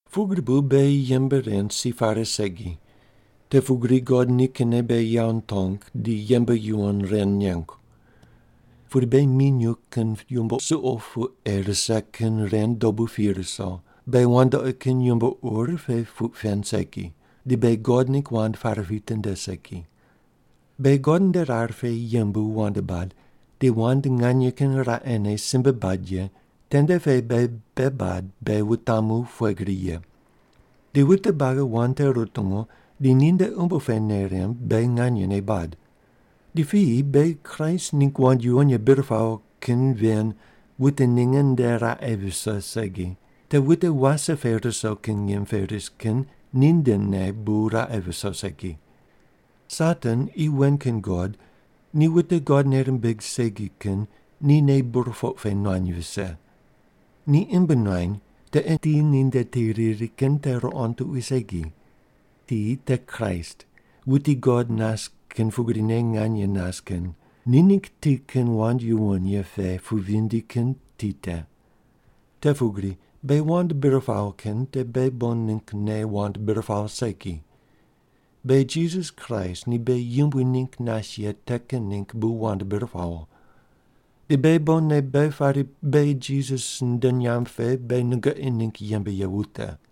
Pugri bu beghi yembe ren si pare segi, te pugri God nikinne beghi yawo nitong di yembe yuwon ren nengu. Pudi beghi minyuw kin yumbo suqo pu ei rise kin ren dobu pi ruso, beghi wandoqi kin yumbo ur pe puq pen segi, di beghi God ningg wand pare pitinde segi. Beghi God nde rar pe yembu wand bad di wand nganye kin raqene simbe bad ye tende pe beghi bei bad beghi wutamu pughe gri ye. Di wute buagi wand te rutungu di ninde umbo pe nei rimb beghi nganyene bad. Di piyi beghi Kraist ningg wand yuwon ye bir pawo kin ven wute ninge nde raqe viso segi, te wute wase pe ruso kin ngim pe ris kin nindene bu raqe viso segi. Satan, qi wen kin god, ni wute God nei rimbig segi kin ni nei burpoq pe nuany vise. Ni imb nuany te ei ti ninde ti riri kin te ruqond tuqui segi. Ti te Kraist, wuti God nas kin pugrine nganye nas kin, ni ningg ti kin wand yuwon ye pe pu vindi kin ti te. Te pugri beghi wand bir pawo kin te beghi bon ninggne wand bir pawo segi. Beghi Jisas Kraist ni beghi Yumbui ningg nas ye te kin ningg bu wand bir pawo. Di beghi bonne beghi pari beghi Jisas nde nyamb pe beghi nungoqi ningg yembe ye wute.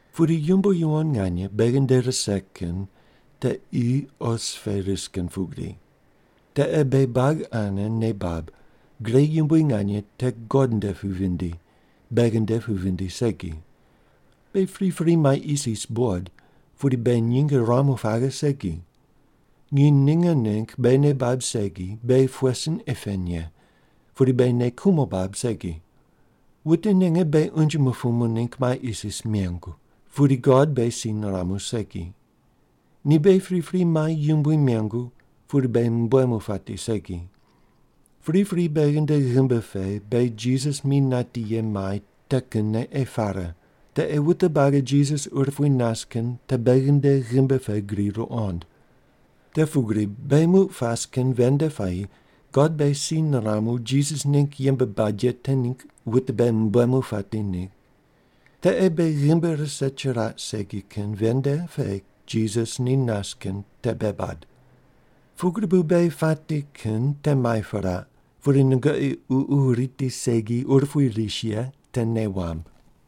Pudi yumbo yuwon nganye beghi nde rise kin te qi os pe ris kin pugri. Te ei beghi buagi ane nei bab, gre yumbui nganye te God nde pu vindi, beghi nde pu vindi segi. Beghi pripri mai isis buqod, pudi beghi nyinge ruamu paghe segi. Nginy ninge ningg beghi nei bab segi beghi pughe sin ei pen ye, pudi beghi nei kumo bab segi. Wute ninge beghi unje mupumu ningg mai isis mengu, pudi God beghi si niramu segi. Ni beghi pripri mai yumbui mengu pudi beghi mumbuemu pati segi. Priprine beghi nde ghimbi pe beghi Jisas mi nati ye mai te kinne ei pare, te ei wute buagi Jisas urupui nas kin te beghi nde ghimbi pe gri ruqond. Te pugri beghi muq pas kin ven nde puayi God beghi si niramu Jisas ningg yembe bad ye te ningg wute beghi mumbuemu pati ningg. Te ei beghi ghimbi rise chiraq segi kin ven nde pe Jisas ni nas kin te bei bad. Pugri bu beghi pati kin te mai piraq, pudi nungoqi ququ riti segi urupui ris ye te nei wamb.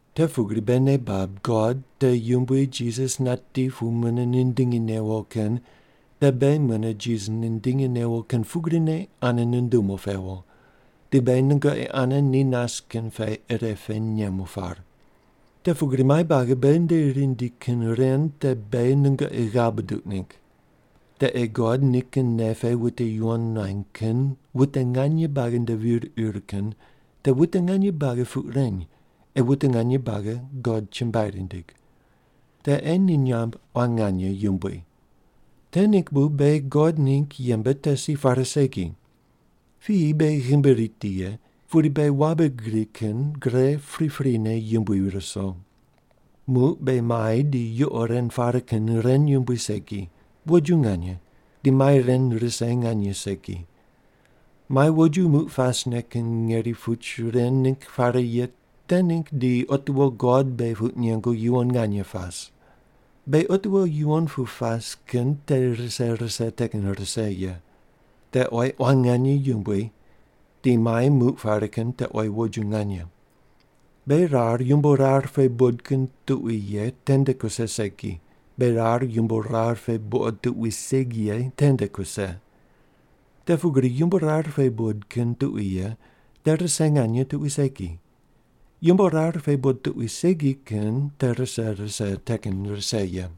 Te pugri beghi nei bab God te Yumbui Jisas nati pu mune nindingi newo kin te beghi mune Jisas nindingi newo kin pugrine ane nundumu pewo di beghi nungoqi ane ni nas kin pe irepe nemu par. Te pugri mai buagi beghi nde rindi kin ren te beghi nungoqi ghav buduq ningg. Te ei God nikin nei pe wute yuwon nuany kin wute nganye buagi nde vir ir kin te wute nganye buagi puq reny ei wute nganye buagi God chumbuai rindig. Te ei ni nyamb quan nganye yumbui. Te ningg bu beghi God ningg yembe te si pare segi. Piyi beghi ghimbi riti ye, pudi beghi wabe gri kin gre priprine yumbui ruso. Muq beghi mai di yuqo ren pare kin ren yumbui segi, woju nganye, di mai ren rise nganye segi. Mai woju muq pasne kin ngeri puch ren ningg pare ye te ningg di otiwo God beghi puq nengu yuwon nganye pas. Beghi otiwo yuwon pu pas kin te rise rise te kin rise ye. Te oyi quan nganye yumbui di mai muq pare kin te oyi woju nganye. Beghi rar yumbo rar pe buqod kin tuqui ye tende kuse segi, beghi rar yumbo rar pe buqod tuqui segi ye tende kuse. Te pugri yumbo rar pe buqod kin tuqui ye te rise nganye tuqui segi, yumbo rar pe buqod tuqui segi kin te rise rise te kin rise ye.